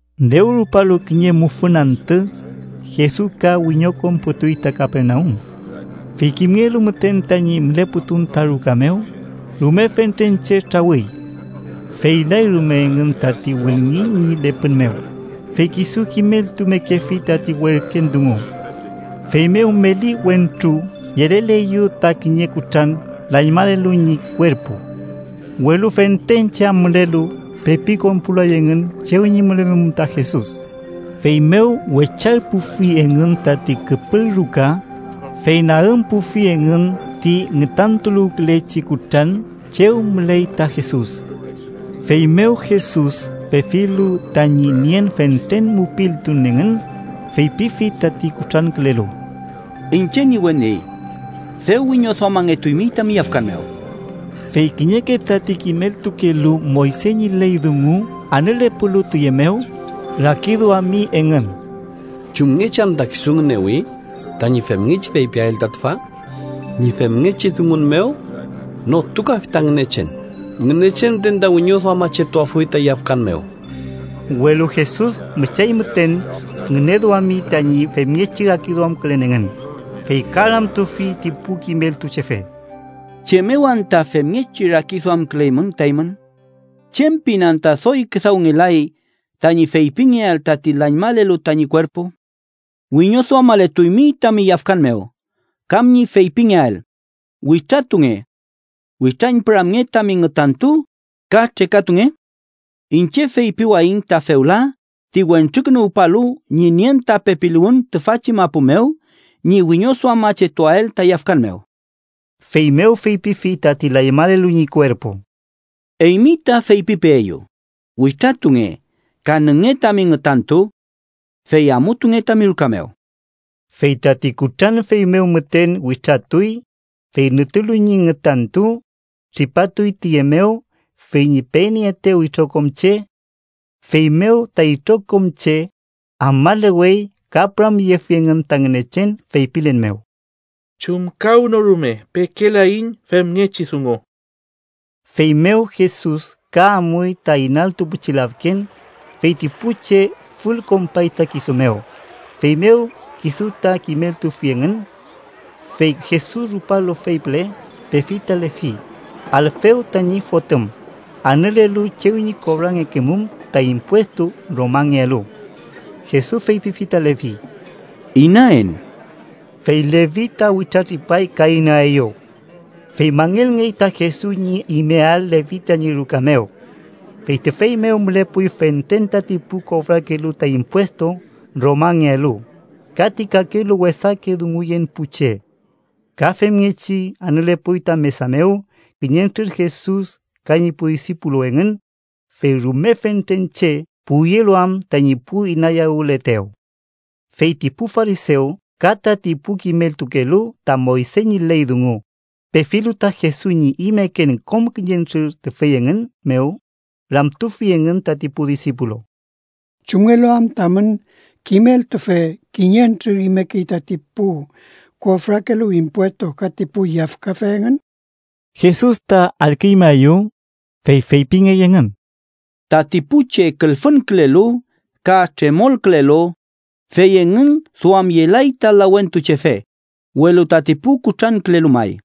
Dew rupalu kiñe mufün antü, Jesus ka wiñokonputuy ta Kapernaum. Fey kimngelu müten tañi mülepun ta ruka mew, rume fentren che trawüy. Feylay rume engün tati wülngiñ ñi lepün mew, fey kisu kimeltumekefi tati werken dungu. Feymew meli wentru yeleleyew ta kiñe kutran lañmalelu ñi kuerpu. Welu fentren che am mülelu, pepi konpulay engün chew ñi mülemum ta Jesus. Feymew wecharpufi engün tati küpül ruka, fey nagümpufi engün ti ngütantuluwkülechi kutran chew müley ta Jesus. Feymew Jesus, pefilu tañi nien fentren mupiltun engün, feypifi tati kutrankülelu: —Iñche ñi weni, dew wiñoduamangetuymi tami yafkan mew. Fey kiñeke tati kimeltukelu Moyse ñi ley dungu anülepulu tiye mew, rakiduami engün: “¿Chumngechi anta kisu ngünewi tañi femngechi feypiael ta tüfa? Ñi femngechi dungun mew notukafi ta Ngünechen. Ngünechen müten ta wiñoduamachetuafuy ta yafkan mew.” Welu Jesus müchay müten ngüneduami tañi femngechi rakiduamkülen engün, fey ka ramtufi ti pu kimeltuchefe: —¿Chem mew anta femngechi rakiduamküleymün ta eymün? ¿Chem pin anta doy küdawngelay tañi feypingeael tati lañmalelu tañi kuerpu: ‘Wiñoduamaletuymi tami yafkan mew’, kam ñi feypingeael: ‘Witratunge. Witrañpüramnge tami ngütantu ka trekatunge’? Iñche feypiwayiñ ta fewla ti Wentrukünuwpalu ñi nien ta pepiluwün tüfachi mapu mew ñi wiñoduamachetuael ta yafkan mew. Feymew feypifi tati lañmalelu ñi kuerpu: —Eymi ta feypipeeyu: witratunge ka nünge tami ngütantu. Fey amutunge tami ruka mew. Fey tati kutran feymew müten witratuy, fey nütulu ñi ngütantu, tripapatuy tiye mew fey ñi penieetew itrokom che. Feymew ta itrokom che afmalewey ka püramyefi engün ta Ngünechen feypilen mew: —Chumkawnorume pekelaiñ femngechi dungu. Feymew Jesus ka amuy ta inaltu pichi lafken, fey ti pu che fülkonpay ta kisu mew, feymew kisu ta kimeltufi engün. Fey Jesus rupalu fey püle, pefi ta Levi, Alfew tañi fotüm, anülelu chew ñi kofrangekemum ta impuestu Romangealu. Jesus feypifi ta Levi: —Inaen. Fey Levi ta witratripay ka inaeyew. Fey mangelngey ta Jesus ñi imeael Levi tañi ruka mew. Fey tüfey mew mülepuy fentren tati pu kofrakelu ta impuestu Romangealu, ka ti kakelu wesake dunguyen pu che. Ka femngechi anülepuy ta mesa mew kiñentrür Jesus ka ñi pu disipulu engün, fey rume fentren che puwyelu am tañi pu inayawületew. Fey ti pu farisew ka tati pu kimeltukelu ta Moyse ñi ley dungu, pefilu ta Jesus ñi imeken kom kiñentrür tüfey engün mew, ramtufi engün tati pu disipulu: —¿Chumngelu am tamün kimeltufe kiñentrür imekey tati pu kofrakelu impuestu ka ti pu yafkafe engün? Jesus ta allküñmaeyew, fey feypingey engün: —Tati pu che külfünkülelu ka tremolkülelu fey engün duamyelay ta lawentuchefe, welu tati pu kutrankülelu may.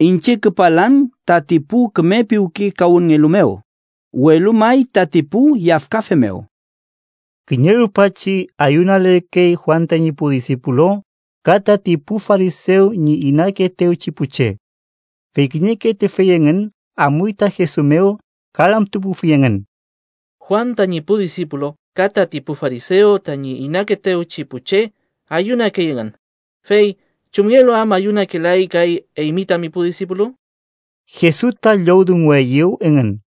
Iñche küpalan tati pu küme piwkekawünnngelu mew, welu may tati pu yafkafe mew. Kiñe rupachi ayunalerkey Juan tañi pu disipulu ka tati pu farisew ñi inakeetewchi pu che. Fey kiñeke tüfey engün amuy ta Jesus mew ka ramtupufi engün: —Juan tañi pu disipulu ka tati pu farisew tañi inakeetewchi pu che ayunakey engün, fey ¿chumngelu am ayunakelay kay eymi tami pu disipulu? Jesus ta llowdungueyew engün: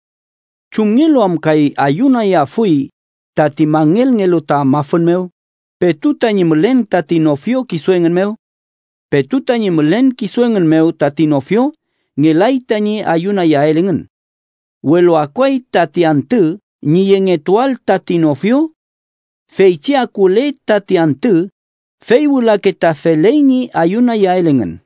—¿Chumngelu am kay ayunayafuy tati mangelngelu ta mafün mew, petu tañi mülen tati nofio kisu engün mew? Petu tañi mülen kisu engün mew tati nofio, ngelay tañi ayunayael engün. Welu akuay tati antü ñi yengetuael tati nofio. Feychi akule tati antü, fey wülake ta feley ñi ayunayael engün.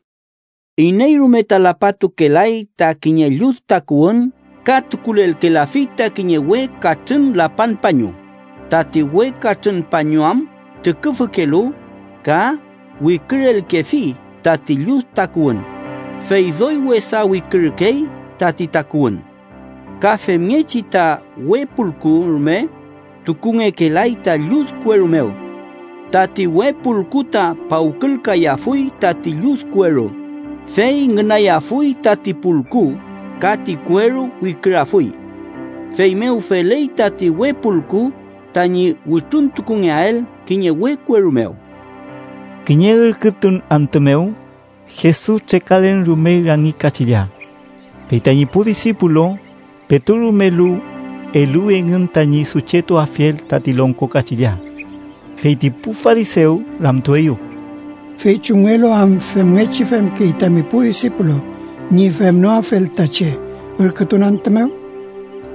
“Iney rume ta lapatukelay ta kiñe llud takuwün ka tukulelkelafi ta kiñe we katrün lapan pañu, tati we katrün pañu am trüküfükelu ka wikürelkefi tati llud takuwün, fey doy wesa wikürükey tati takuwün. Ka femngechi ta we pulku rume tukungekelay ta llud kueru mew. Tati we pulku ta pawkülkayafuy tati llud kueru, fey ngünayafuy tati pulku ka ti kueru wikürafuy. Feymew feley tati we pulku tañi wütruntukungeael kiñe we kueru mew.” Kiñe ürkütun antü mew, Jesus trekalen rumey rangi kachilla. Fey tañi pu disipulu, petu rumelu, eluwi engün tañi suchetuafiel tati longko kachilla. Fey ti pu farisew ramtueyew: —Fey ¿chumngelu am femngechi femkey tami pu disipulu ñi femnoafel ta che ürkütun antü mew?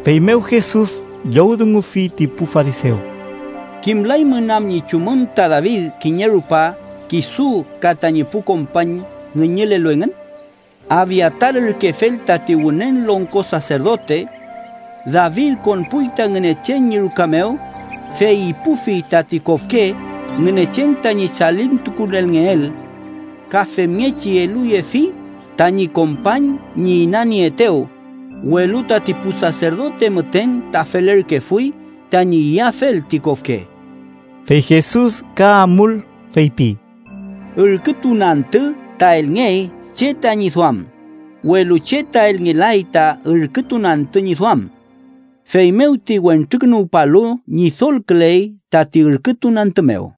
Feymew Jesus llowdungufi ti pu farisew: —¿Kimlaymün am ñi chumün ta David kiñe rupa kisu ka tañi pu kompañ ngüñülelu engün? Abiatar ürkefel tati Wünen Longko Saserdote. David konpuy ta Ngünechen ñi ruka mew, fey ipufi tati kofke Ngünechen tañi chalintukulelngeel. Ka femngechi eluyefi tañi kompañ ñi inanieetew, welu tati pu saserdote müten ta felerkefuy tañi iyafel ti kofke. Fey Jesus ka amul feypi: —Ürkütun antü ta elngey che tañi duam, welu che ta elngelay ta ürkütun antü ñi duam. Feymew ti Wentrukünuwpalu Ñidolküley tati ürkütun antü mew.